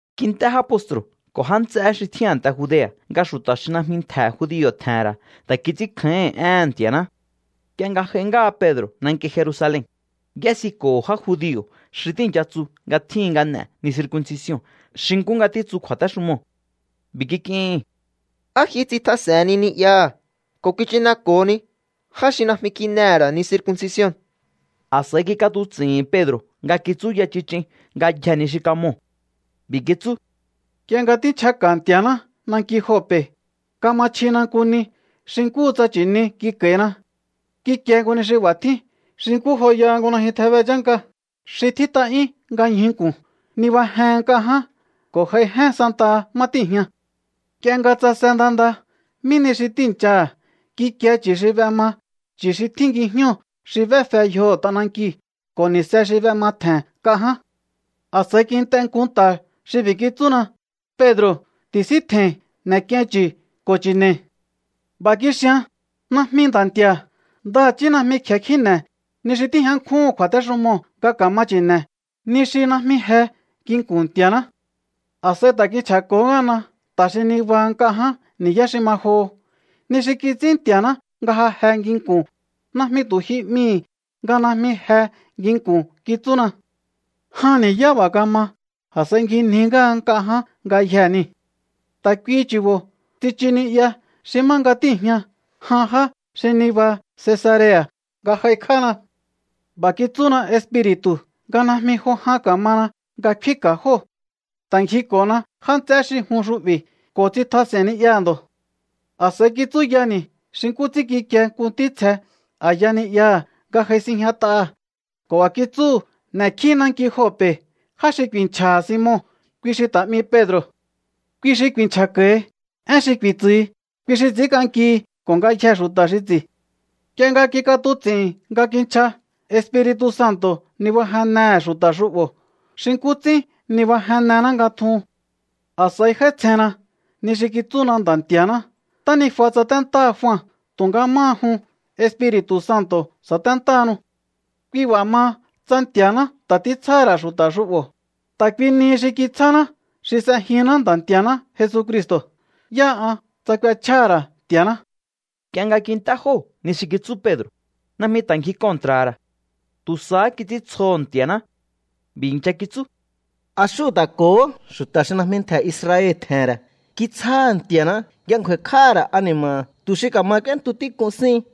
Kint'é já postru̱ ko̱ já nts'eé xi tjín a̱nte Judea̱ nga xu̱ta̱ xi najmi ntje̱ judio̱ tje̱he̱n ra̱ ta̱ kits'ínkjáíhi̱n éhe̱n Nti̱a̱ná. Nk'ie nga j'ai ngáha Pedro̱ nanki Jerusalen, y'ésiko̱ho̱ já judio̱ xi tíi̱ncha tsu nga tjíhin nga n'e̱ ni circuncision xi nkú nga títsu kju̱a̱téxumoo̱. B'i̱ kik'ihi̱n: —¿Á ji tsitjas'e̱henni ni'yaha̱ ko̱ kichineko̱honi já xi najmi kin'ehe̱ ra̱ ni circuncision? A̱s'a̱i kik'atuts'i̱hi̱n Pedro̱ nga kitsúya chich'in ngayjee̱ ni xi kamoo̱. B'i̱ kitsú: —Nk'ie nga tínchjaka̱ Nti̱a̱ná nanki Jope̱, kama chjina nku ni xi nkúhu tsa nchi̱ni kik'a̱i̱na. Kikie nku ni xi b'a̱ tjín xi nkú joyaha nku najyun tjebe chánka xi tjít'a'yún nga ñjuu̱ nku̱n. Nibajehen nk'a ján ko̱ j'aijén santaha má tíi̱jña. Nk'ie nga tsase nda nda mí nihi xi tíi̱nchaha̱, kikie chu̱ xi b'ema, chu̱ xi tjín ngijñóo̱, xi b'éfe yjoho̱ t'anankiu̱ ko̱ ni̱se xi b'ematje̱n nk'a ján. ’A̱s'a̱i kint'e nku nta̱ xi b'i̱ kitsúna: “Pedro̱, ti̱síntje̱i̱n. N'e̱k'iein chu̱ ko̱ chi̱ne̱i̱.” B'a̱ kixian: “Najmi, Nda̱ Nti̱a̱. Ndaha̱chí najmi kje̱e kjíne̱ ni xi tíjña nkjúhu̱n kju̱a̱téxumoo̱ nga ka̱ma chi̱ne̱, ni xi najmi je nginku̱n Nti̱a̱ná.” A̱s'a̱i ta̱ kinchja̱ko̱hó ngáhana nta̱ xi nibaha nk'a ján ni̱yá xi ma joho. “Ni xi kits'ín Nti̱a̱ná nga ja je nginku̱n, najmi tu̱ ji 'mihi̱ nga najmi je nginku̱n”, kitsúna. Jan ni̱yá b'a̱ kama, a̱s'a̱i ngjinji ngáha nk'a ján ngayjee̱ niu̱. ’Ta̱ kuihi chu̱bo̱ tsichu ni'ya xi má nga tíi̱jña jan já xi nibaha Cesarea̱ nga j'aikj'ána. B'a̱ kitsúna Espiri̱tu̱ nga najmi jo jan ka̱mana nga kfínka̱ jóo̱. Ta̱ ngjiko̱na já nts'eé xi jun xu'bi̱ ko̱ tsitjas'e̱i̱n ni'yaha̱ ndo̱. A̱s'a̱i kitsúyani̱ xi nkú ts'ín kikie nku ntítsje a̱ya ni'yaha̱ nga j'ai sinjñat'aha̱ ko̱ b'a̱ kitsúhu̱: “N'e̱kjí naki Jope̱ já xi ku̱i̱nchja̱ha̱ Simon, kui xi ta̱ 'mi Pedro̱. Kui xi ku̱i̱nchja̱ko̱hi. Én xi ku̱i̱tsu̱hi, kui xi ts'i̱ínk'ankihi ko̱ ngayjee̱ xu̱ta̱ xi ts'i̱.” ’Nk'ie nga kik'atuts'i̱hi̱n nga kinchja, Espiri̱tu̱ Santo̱ nibajennehe̱ xu̱ta̱ xu'bo̱ xi nkú ts'ín nibajennená nga tjuhun. A̱s'a̱i j'áítsjenna ni xi kitsúná Nda̱ Nti̱a̱ná: “Ntánijua tsaténtáha Jua tu̱nga máha jun, Espiri̱tu̱ Santo̱ sa̱téntáhanu.” Kui b'a̱ maha, tsa Nti̱a̱ná ta̱ títsjáha̱ ra̱ xu̱ta̱ xu'bo̱ ta̱ kui nihi xi kitsjáná xi s'ejinná Nda̱ Nti̱a̱ná Jesucristo̱, ¿yáha an tsa k'uechjáha̱ ra̱ Nti̱a̱ná? Nk'ie nga kint'é jóo̱ ni xi kitsú Pedro̱, najmi ta̱ ngji kontra̱ha̱ ra̱. Tu̱ sahá kits'íntsjoho̱ Nti̱a̱ná. B'i̱ i̱ncha kitsú: —A xúhu̱ ta̱ ko̱hó xu̱ta̱ xi najmi ntje̱ Israel tje̱he̱n ra̱ kitsjáha̱ Nti̱a̱ná nga ngju̱a̱i̱kj'áha̱ ra̱ ani̱ma̱ha̱ tu̱ xi ka̱ma k'úéntu tík'un síhin.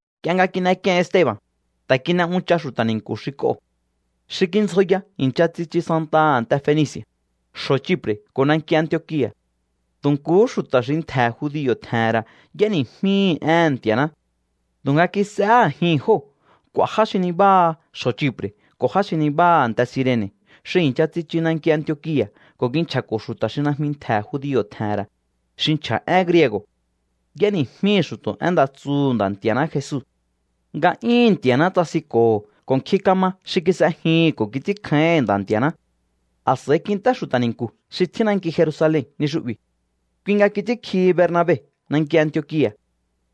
Nk'ie nga kin'ek'ien Esteba̱n, ta̱ kin'e uncha xu̱ta̱ ni̱nku̱ xi k'oo̱. Xi kindzjoya i̱ncha tsichu santaha a̱nte Fenici̱a̱, xjo̱ Chipre̱ ko̱ nanki Antiokia̱. Tu̱ nkuhú xu̱ta̱ xi ntje̱ judio̱ tje̱he̱n ra̱ y'éni̱jmíhi̱ éhe̱n Nti̱a̱ná. Tu̱nga kis'ehé a̱jihi̱n jóo̱ k'u̱a̱ já xi nibáha xjo̱ Chipre̱ ko̱ já xi nibáha a̱nte Cirene̱ xi i̱ncha tsichu nanki Antiokia̱ ko̱ kinchja̱ko̱ xu̱ta̱ xi najmi ntje̱ judio̱ tje̱he̱n ra̱, xi nchja̱ én griego̱. Y'éni̱jmíhi̱ xu̱to̱ én nda tsuhu̱ Nda̱ Nti̱a̱ná Jesu. Nga'yúhu̱n Nti̱a̱ná tsasinko̱ho̱ ko̱ nkjin kama xi kis'ejihi̱n ko̱ kits'ínkjáíhi̱n Nda̱ Nti̱a̱ná. A̱s'a̱i kint'é xu̱ta̱ ni̱nku̱ xi tjín nanki Jerusalen ni xu'bi̱. Kui nga kits'ínkjihi Bernabe nanki Antiokia̱.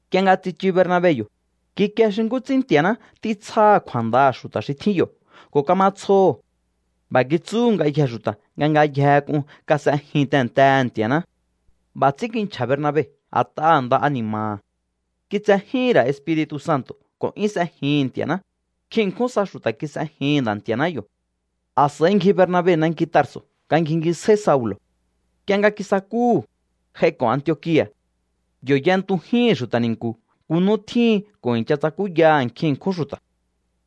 Nk'ie nga tsichu Bernabe yo̱, kikie xi nkú ts'ín Nti̱a̱ná títsjáha̱ kju̱a̱ndaha̱ xu̱ta̱ xi tjín yo̱ ko̱ kama tsjoho̱. B'a̱ kitsúhu̱ ngayjee̱ xu̱ta̱ nga ngayjehe k'un kas'ejin tehe̱ntehe̱ Nti̱a̱ná. B'a̱ ts'ín kinchja̱ Bernabe a̱t'aha̱ nda ani̱ma̱ha̱. Kitsejíhi̱n ra̱ Espiri̱tu̱ Santo̱ ko̱ 'yún s'ejihi̱n Nti̱a̱ná. Nkjin ṉkjún sa xu̱ta̱ kis'ejihi̱n Nda̱ Nti̱a̱ná yo̱. A̱s'a̱i ngji Bernabe nanki Tarso̱ nga ngjingisjáí Saulo̱. Nk'ie nga kisakúhu̱, j'aiko̱ Antiokia̱. Yo̱ y'entujíhi̱n xu̱ta̱ ni̱nku̱ nku nú tjíhin ko̱ i̱ncha tsakúyaha̱ nkjin ṉkjún xu̱ta̱.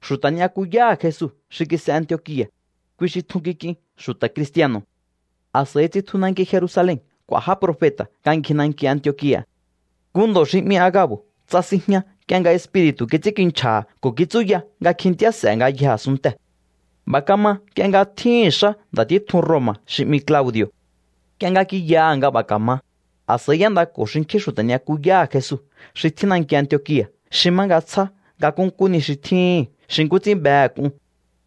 Xu̱ta̱ ni'yakuyáha̱ Jesu xi kis'e Antiokia̱, kui xi tjun kik'in xu̱ta̱ cristiano̱. A̱s'a̱i tsitju nanki Jerusalen k'u̱a̱ já profeta̱ nga ngji nanki Antiokia̱. Nku ndo̱ xi 'mi Aga̱bo̱ tsasinjña nk'ie nga Espiri̱tu̱ kits'ínkinchja̱ha̱ ko̱ kitsúya nga kjintíá s'e̱ ngayjee̱ a̱sunntee̱. B'a̱ kama nk'ie nga tjíhi̱n xá nda̱ títjun Roma̱ xi 'mi Claudi̱o̱. Nk'ie nga kiyaha̱ nga b'a̱ ka̱ma, a̱s'a̱i y'éndako̱ xinkjín xu̱ta̱ ni'yakuyáha̱ Jesu xi tjín nanki Antiokia̱ xi má nga tsjá nga nkúnkú ni xi tjíhi̱n xi nkú ts'ín behe̱ k'un,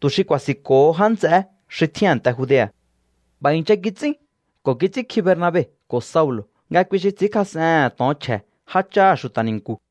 tu̱ xi ku̱a̱si̱nko̱ho já nts'eé xi tjín a̱nte Judea̱. B'a̱ i̱ncha kits'ín ko̱ kits'ínkji Bernabe ko̱ Saulo̱ nga kui xi ts'i̱ínkjas'ehe̱n to̱on chje̱ jácháha̱ xu̱ta̱ ni̱nku̱.